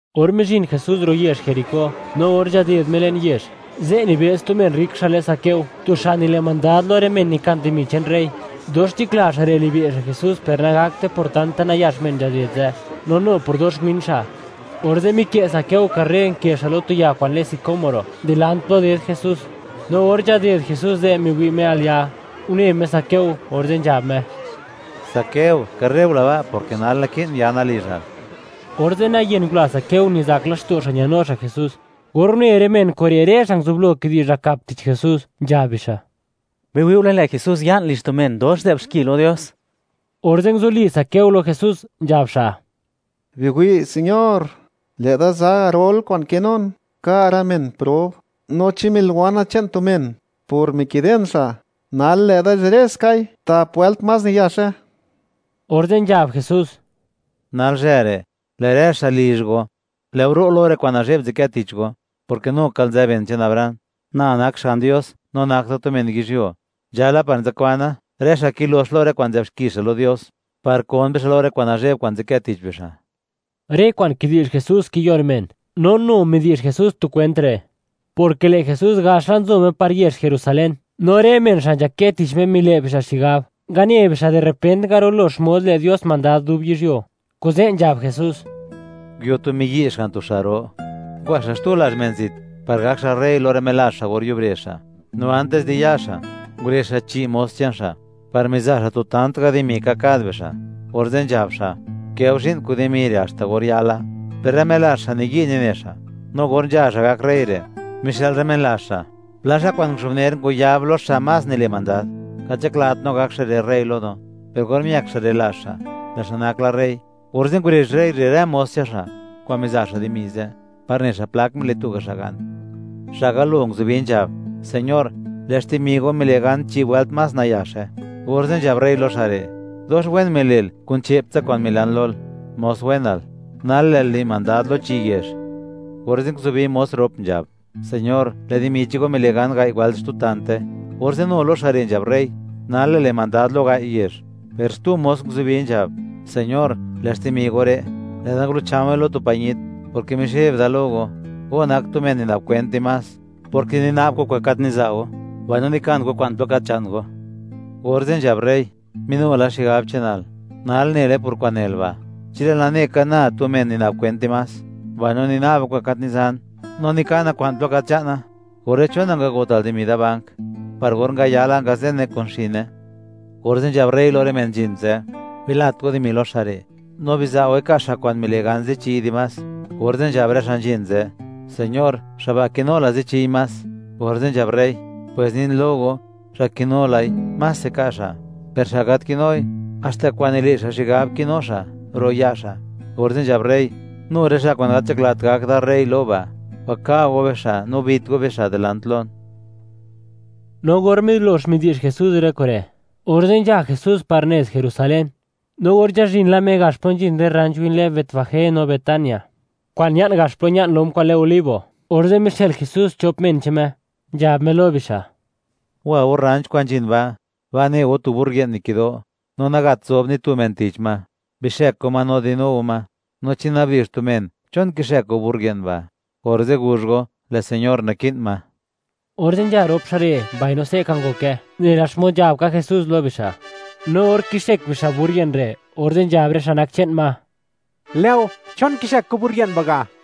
Or mizhin Jesús ro' yezh Jericó, no or nzhaded Me le'n yezh, ze' nibëz tu men rrik xa' lë Zaqueo; tu xa' nile' mandad lo rë men nikan dimi che'n rey. Dox nzhakla xa' re' libe' xa' Jesús, per nagakte por tanta nayax men nzhaded ze', no nu por dox win xa'. Orze' mikë' Zaqueo karre, nkë xa' lo tu ya kwa'n lë sicómoro, dilant plo ded Jesús. No or nzhaded Jesús ze', miwi' Me al ya', une Me Zaqueo, orze' nzhab Me: ―Zaqueo, karre gula ba', porke nal, naki'n yana lizhal. Orze' nayen ngula Zaqueo, nizak laxto' xa' ñanu xa' Jesús. Or une rë men kure', rë xa' nguzublo kidi'zh nakap tich Jesús, nzhab bixa': ―¡Biwi'ule!, lë' Jesús ya'n lizh tu men dox nzë'b xki lo Dios. Orze' nguzuli Zaqueo lo Jesús, nzhab xa': ―Biwi' Señor; lë'da za garol kwa'n kinun, ka' rë men prob; no chi miliwana che'n tu men, por mikiden xa', nal lë'da zhireskai tap wëlt más nayaxe. Orze' nzhab Jesús: ―Nalzhë re', lë' rë xa' lizh go, lë' go ro' lo rë kwa'n nazhe'b nzadkë tich go, porke nukal nzë ben che'n Abraham. Na nak Xga'n Dios, no nak da tu men yizhyuo, nzhala par nzakwana, rë xa' kilox lo rë kwa'n nzë'b xki xa' lo Dios, par kon bixa' lo rë kwa'n nazhe'b, kwa'n nzadkë tich bixa'. Rë kwa'n kidi'zh Jesús kiyon men, no nu midi'zh Jesús tu kwent re', porke lë' Jesús gax la nzo Me par yezh Jerusalén, no rë men xa' nzhakë tich Me mile' bixa' xigab, ngane bixa' di repent, ngarulo xmod le' Dios mandad dub yizhyuo, kuze' nzhab Jesús: ―Nguio tu miyi' xga'n tu xa' ro, ngwa xa' xtu lazh men zit, par gak xa' rey lo rë melazh xa' or yubre xa'. No antis di ya xa', ngurezh xa' chi' mos che'n xa' par miza' xa' tu tant ga' dimi ka' kad bixa', orze' nzhab xa': “Gukë go zhi'n kun dimi re', haxta or yala.” Per rë melazh xa', niyi' nine xa', no or nzha xa' gak rey re', mixë'l rë men lazh xa' pla xa' kwa'n nguzhubner ngwayab lo xa' más nile' mandad: “Gat nzhaklat no gak xa' re' rey lo no.” Per or miëk xa' re' lazh xa', lë' xa' nak la rey; orze' ngurezh rey re' rë mos che'n xa' kwa'n miza' xa' dimi ze', par ne xa' plak mile' tuga' xa' gan. Xa' galo nguzubi, nzhab: “Señor, lë' xtimi go mile' gan chi' wëlt más nayaxe.” Orze' nzhab rey lo xa' re': “Dox wen mile'l, kun che'p tsa kwa'n milan lol, mos wenal. Nal lë'l le' mandad lo chi' yezh.” Orze' nguzubi mos rop, nzhab: “Señor, lë' dimi che'n go mile' gan gai' wëlt xtu tante.” Orze' nu lo xa' re' nzhab rey: “Nal lë'l le' mandad lo gai' yezh.” Per xtu mos nguzubi, nzhab: “Señor, lë' xtimi go re', lë'da ngulucha̱we̱ lo tu pañit; porke mizheb da lo go, go nak tu men nina'b kwent dimás; porke nina'b go kwa'n gat niza' go, mbaino nikan go kwa'n plo gat nzha'nt go.” Orze' nzhab rey: “¡Minu la xigab che'nal! Nal nele por kwa'n nel ba'. Chi lë'l nane ka, na tu men nina'b kwent dimás, mbaino nina'ba kwa'n gat nizan, no nikana kwa'n plo gat nzha'na, orze', ¿chon nangagotal dimi da bank, par or ngayala, ngazene kun xine?” Orze' nzhab rey lo rë men nzhin ze': “Bilat go dimi lo xa' re', no biza' goi, ka' xa' kwa'n mile' gan zichi'y dimás.” Orze' nzhab rë xa' nzhin ze': “Señor, xa' ba' kinu la zi chi'y más.” Orze' nzhab rey: “Pwes nin lo go, xa' kinu lai, mase ka' xa'; per xa' gat kinui, haxta kwa'n nile' xa' xigab kinu xa', ro' ya' xa'.” Orze' nzhab rey: “Nu rë xa' kwa'n gat nzhaklat gak da rey lo ba', waka' go bixa', no bit go bixa', dilant lon.” No or milox midi'zh Jesús rë kure', orze' nzha Jesús par nez Jerusalén. No or nzhazhin la Me gax plo nzhin rë rranch kwa'n lë Betfagé no Betania, kwa'n ña'n gax plo ña'n lom kwa'n lë Olivo, orze' mixë'l Jesús chop men che'n Me, nzhab Me lo bixa': ―Wa go rranch kwa'n nzhin ba', ba' ne go tu burrit nikido', no nagat zob ni tu men tich ma; bixëk go ma no di'nu go ma, no chi nabdi'zh tu men: “¿Chon kixëk go burrit ba'?”, orze' guzh go: “Lë' Señor naki'n ma.” Orze' nzha rop xa' re', mbaino se'ka ngoke, nela xmod nzhab ka Jesús lo bixa', no or kixëk bixa' burrit re', orze' nzhab rë xa' nak che'n ma: ―Lë'go, ¿chon kixëk go burr ye'n ba' ga'?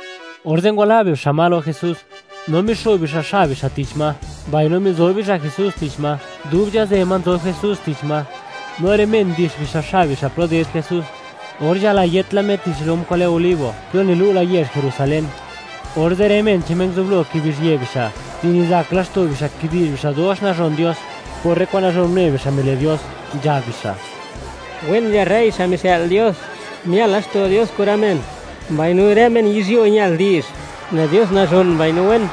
Orze' ngwala' bixa' ma lo Jesús, no mixo'b bixa' xab bixa' tich ma, mbaino mizob bixa' Jesús tich ma. Dub nzhazë ma nzob Jesús tich ma, no rë men ndix bixa' xab bixa' plo ded Jesús. Or nzhalayët la Me, tich lom kwa'n lë Olivo, plo nilu' la yezh Jerusalén, orze' rë men che'n Me nguzublo kibizhië bixa' di nizak laxto' bixa', kidi'zh bixa' dox nazhon Dios, por rë kwa'n nazhon une bixa', mile' Dios, nzhab bixa': ―¡Wen nzha rey xa' mixë'l Dios! ¡Mial laxto' Dios kun rë men!, mbaino rë men yizhyuo ñal di'zh: “¡Lë' Dios nazhon mbaino wen!”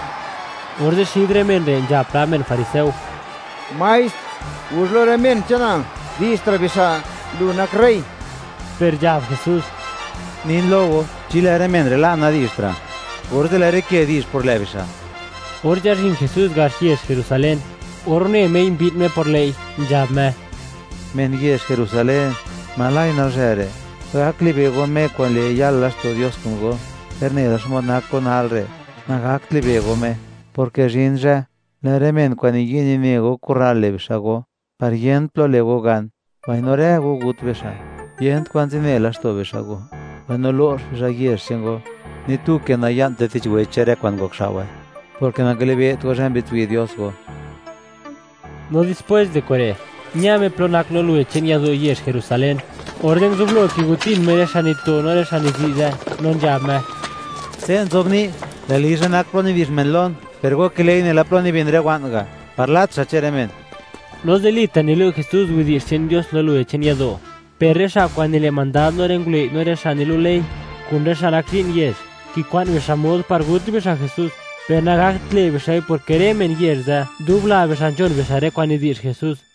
Orze' xid rë men re', nzhab pla men fariseo: ―¡Maestr, guzh lo rë men che'nal, di'zhtra' bixa', lu nak rey! Per nzhab Jesús: ―Nin lo go, chi lë' rë men re' la', nadi'zhtra', orze', ¡lë' rë ke di'zh por lë' bixa'! Or nzhazhin Jesús gax yezh Jerusalén, or une Mei, mbi'n Me por lë'i, nzhab Me: ―¡Men yezh Jerusalén, oj nal zhë re', gak libe' go Me kwa'n le', yal laxto' Dios kun go!, per nela xmod nak go nal re', nagakt libe' go Me, porke zhin zhë, lë' rë men kwa'n niyi' nine go, kurral le' bixa' go, par yent plo le' go gan, mbaino rë go gut bixa', yent kwan zine laxto' bixa' go, mbaino lo'x bixa' yezh che'n go, ni tu ke naya'nte tich weche, rë kwa'n ngokxao'we, porke nangalibe't go, zhë mbi'dtswi' Dios go. No dispwés di kure', ña Me plo nak lo luwe che'n yado' yezh Jerusalén, orze' nguzublo kigotin Me rë xa' nito, no rë xa' nizi' ze', no nzhab Me: ―Se' nzobni': “Lë' lizha nak plo nidi'zh men Lon”, ¡per go kile'i nela plo nibin rë wa'n ga', par lat xa' che'n rë men! No zilita' nilu' Jesús widi'zh che'n Dios, lo luwe che'n yado', per rë xa' kwa'n nile' mandad lo rë ngulëi', no rë xa' nilu' ley, kun rë xa' nak zhi'n yezh; kikwa'n bixa' mod par gut bixa' Jesús, per nangakt le' bixa'i, porke rë men yezh ze', dubla bixa' nzhon bixa' rë kwa'n nidi'zh Jesús.